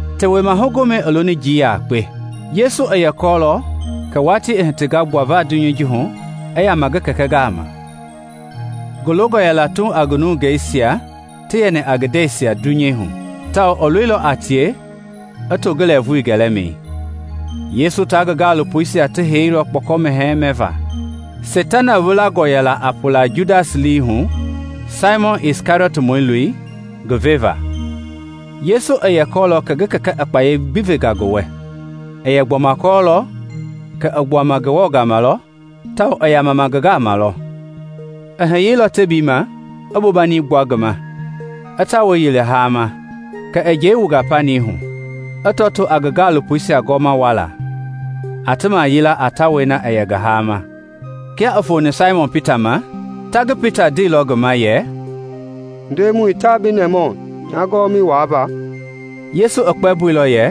Tewema Gomɛi i loni na njii yakpe. Yesu i yɛ kɔɔlɔ kɛ watii i hitinga ngi gbuava dunyei ji hu i yama ngi Kɛkɛ gama. Ngi longɔ yɛla Tuuŋ a nungei nasia ti yɛni a ngi ndɛisia dunyei hu, tawao i loilɔ a tie i to ngi lɛɛvui gɛlɛmɛi. Yesu tia ngi gaalopoisia ti heiilɔ kpɔkɔ mɛhɛɛi mɛva. Seitana wilangɔ yɛla a pula Judas lii hu, Saimɔn Kɛriɔtmɔi loi, ngi veva. Yesu i yɛ kɔɔlɔ kɛ ngi Kɛkɛ i kpayei gbi venga ngi wɛ; i yɛ gbɔma kɔɔlɔ kɛ i gbuanga Ngewɔ gama lɔ tawao i yamama Ngewɔ gama lɔ. I hiyeilɔ tebiima, i bobani gbua ngi ma, i tawɛi yili haama. Kɛ i njɛi wunga panii hu, i tɔtoo a ngi gaalopoisia gɔwɔma wuala, a ti mayila a tawɛi na i yɛ ngi haama. Kia i foni Saimɔn Pita ma, ta ngi Pita i ndeilɔ ngi ma yɛ, “Ndemɔi, taa bi nɛmahu nya gɔwɔmɛi wuava?” Yesu i kpɛmboilɔ yɛ,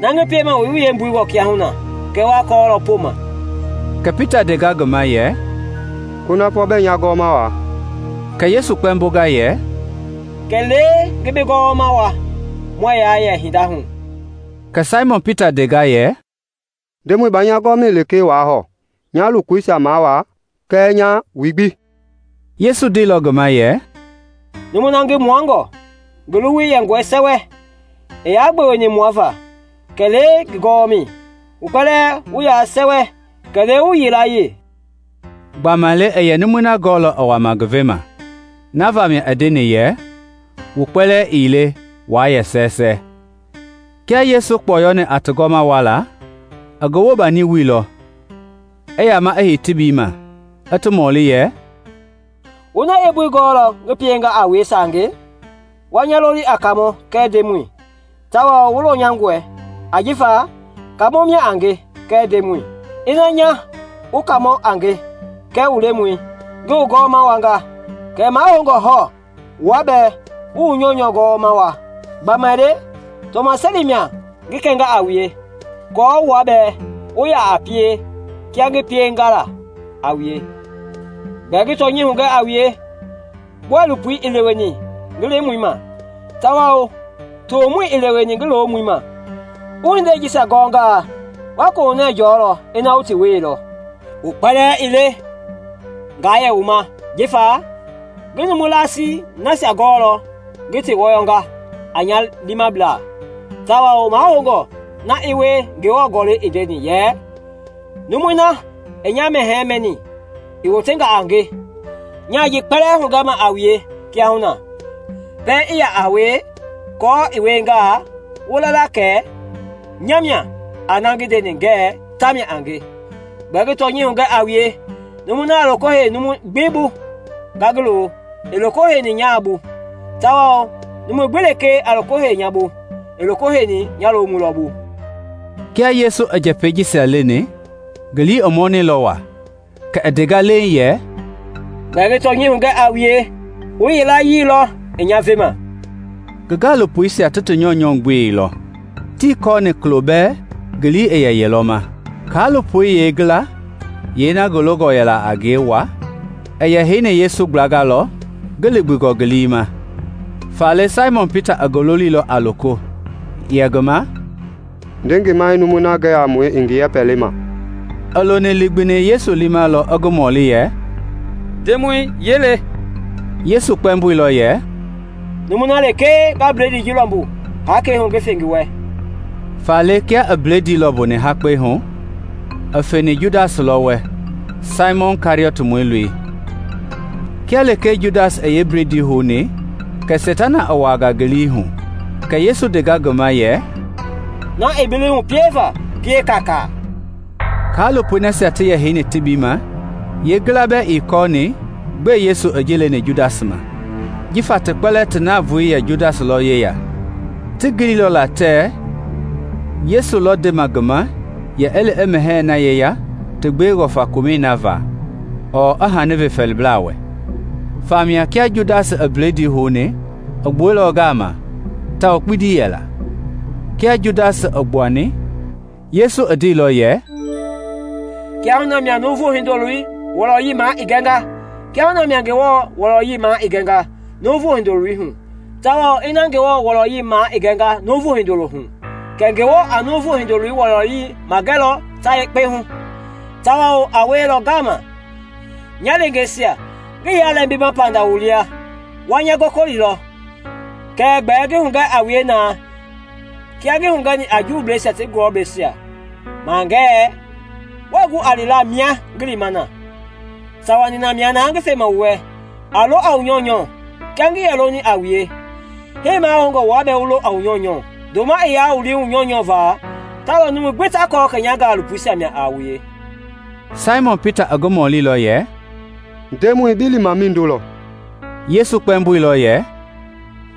“Na ngi piema wuii yeembui gɔɔ kiahuna kɛɛ wa kɔɔlɔ poma.” Kɛ Pita i ndenga ngi ma yɛ, “Kunafɔ bɛɛ nya gɔwɔma wua!” “Kɛ Yesu kpɛmbonga yɛ, Kɛlee ngi bi gɔwɔma wua muɛɛ yaa yɛ hinda hu.” Kɛ Saimɔn Pita i ndenga yɛ, “Ndemɔi, baa nya gɔwɔmɛi lekee wua hɔɔ, nya lokoisia mawua kɛɛ nya wui gbi.” Yesu i ndeilɔ ngi ma yɛ, “Numui na ngi muangɔ, ngi luwui yɛngɔ sɛwɛ, ii yaa gbeweni mua va, kɛlee ngi gɔwɔmɛi; wu kpɛlɛɛ wu yaa sɛwɛ, kɛlee wu yilayee.” (Gbamaile i yɛ numui na gɔɔlɔ i wama ngi vema; na vamia i ndeni yɛ, “Wu kpɛlɛɛ ii le waa yɛ sɛwɛ.”) Kia Yesu i kpɔyɔni a ti gɔwɔmɛisia mawuala, i ngi bobani wuilɔ, i yama i hei ngi heimi tebii ma, i ti mɔli yɛ, “Wu na yeembui gɔɔlɔ ngi pienga a wue saange? Wa nya loli a Kaamɔ kɛɛ Ndemɔi; tawao wu lɔnyangɔe ajifa Kaamɔi mia a nge kɛɛ Ndemɔi. Ina nya, wu Kaamɔ a nge kɛɛ wu Lemɔi, ngi wu gɔwɔma wuanga, kɛ mahoungɔi hɔɔ wua bɛɛ wu wu nyɔunyɔ gɔwɔma wua. Gbamaile tɔmaseli mia ngi kɛnga a wue aako wua bɛɛ wu ya a pie kia ngi pieni la a wue. Gbɛɛ ngi tɔnyɛi hugɛ a wue, bɔilopoi ii leweni ngi lemɔi ma; tawao tomɔi ii leweni ngi lomɔi ma. Wu hindei jisia gɔngaa, wa kohunɛ jɔlɔ ina wu ti wieilɔ. “Wu kpɛlɛɛ ii le nga yɛ wu ma; jifa ngi numu laasii nasia gɔɔlɔ ngi ti wɔyɔnga a nya liimablaa; tawao mahoungɔ na i wie Ngewɔ Gɔlɛi i ndeni yɛ ‘Numui na i nya mɛhɛɛi mɛni, i wotenga a nge.’ Nyaa ji kpɛlɛɛ hugɛma a wue kiahuna, pɛiŋ i yaa wie, aako i wiengaa, wu la la kɛ ‘Nya mia a na ngi ndeni ngɛɛ tamia a nge.’ Gbɛɛ ngi tɔnyɛi hugɛ a wue, numui na a loko hei numu gbi bu nga ngi lo, i loko heini nya bɛɛ lɔ bu; tawao numu gbi lekee a loko hei nya bu, i loko heini nya lomɔi lɔ bu.” Kia Yesu i njɛpɛi jisia leni, ngi lii i nyanilɔ waa, kɛ i ndenga leeŋ yɛ, “Gbɛɛ ngi tɔnyɛi hugɛ a wue, wu yilayee lɔ i nya vema.” Ngi gaalopoisia ti ti nyɔunyɔ gbeilɔ, tii kɔɔ kulo bɛɛ ngi lii i yelɔ ma. Kaalopoisia yilayee, yeena ngi longɔ yɛla la waa, i yɛ heini Yesu gblanga lɔ ngi ligbingɔ ngi liimɛi; faale Saimɔn Pita i ngi loliilɔ a loko, yɛ ngi ma, “Nde ngi ma i numui na gɛ a mue i ngi yɛpɛ lema.” I loni ligbini Yesu liimɛi lɔ i ngi mɔli yɛ, “Ndemɔi, yee le?” Yesu kpɛmboilɔ yɛ, “Numui na lekee nga bledii ji lɔmbu hakpɛi hu ngi fe ngi wɛ.” Faale kia i bledii lɔmbuni hakpɛi hu, i feni Judas lɔ wɛ, Saimɔn Kɛriɔtmɔi loi. Kia lekee Judas i yeebledii houni, kɛ Seitana i wuaangaa ngi lii hu; kɛ Yesu i ndenga ngi ma yɛ, “Na i bi lii hu pieva, pie kaakaa.” Kaalopoi nasia ti yɛ heini tebii ma yeengila bɛɛ ii yɛ kɔɔ gbɛe Yesu i ji leni Judas ma. Jifa ti kpɛlɛɛ ti navoei i yɛ Judas lɔ yeya, ti lɛɛnga ti giliilɔ tɛɛ Yesu lɔ ndema ngi ma yɛ i li i mɛhɛɛi na yeya ti gbewengɔ faa komɛi va ɔɔ i hani ve fɛɛliblɛisia wɛ. Famia, kia Judas i bledii houni, i gbuɛilɔ ngaama; tawao kpindi yɛla. Kia Judas i gbuani, Yesu i ndeilɔ yɛ, “Kiahuna mia Nuuvu Hindoloi wɔlɔyei maa i gɛnga; kiahuna mia Ngewɔ wɔlɔyei maa i gɛnga Nuuvu Hindoloi hu. Tawao ina Ngewɔ wɔlɔyei maa i gɛnga Nuuvu Hindoloi hu, kɛ Ngewɔ a Nuuvu Hindoloi wɔlɔyei magɛlɔ ta yekpe hu, tawao a wielɔ ngaama. Nya leengeisia, ngii yaa lɛmbima panda wu lia. Wa nya gɔkɔlilɔ; kɛɛ gbɛɛ ngi hugɛ a wue na kia ngi hugɛni la a Juuisia ti gulɔbleisia ma ngɛɛ, ‘Wɛɛ gu a lila mia ngi lima na.’ Sawa nina mia na ngi fema wu wɛ: a lɔ a wu nyɔunyɔ. Kia ngi longa a wue, hii mahoungɔ wua bɛɛ wu lo a wu nyɔunyɔ. Ndoma i yaa wu lii hu wu nyɔunyɔ va, ta lɔ numui gbi ta kɔɔ kɛ nya gaalopoisia lɔ a wue.” Saimɔn Pita i ngi mɔlilɔ yɛ, “Ndemɔi, bi lima mindo lɔ?” Yesu kpɛmboilɔ yɛ,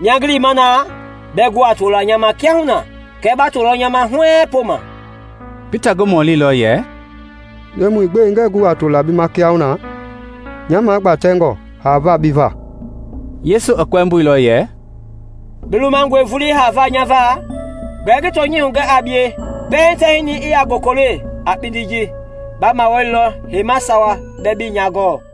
“Mia ngi lima na, bɛɛ gu a tola nya ma kiahuna, kɛɛ ba tolɔ nya ma huɛɛŋ poma.” Pita i ngi mɔlilɔ yɛ, “Ndemɔi, gbɛe ngɛɛ gu a tola bi ma kiahuna? Nya magbatɛngɔe haava bi va.” Yesu i kpɛmboilɔ yɛ, “Bi lumangɔe vulii haava nya va? Gbɛɛ ngi tɔnyɛi hugɛ a bie, pɛiŋ tɛhinɛi i yaa gokole a kpindi ji, ba mawalilɔ heima sawa bɛɛ bii nya gɔɔ.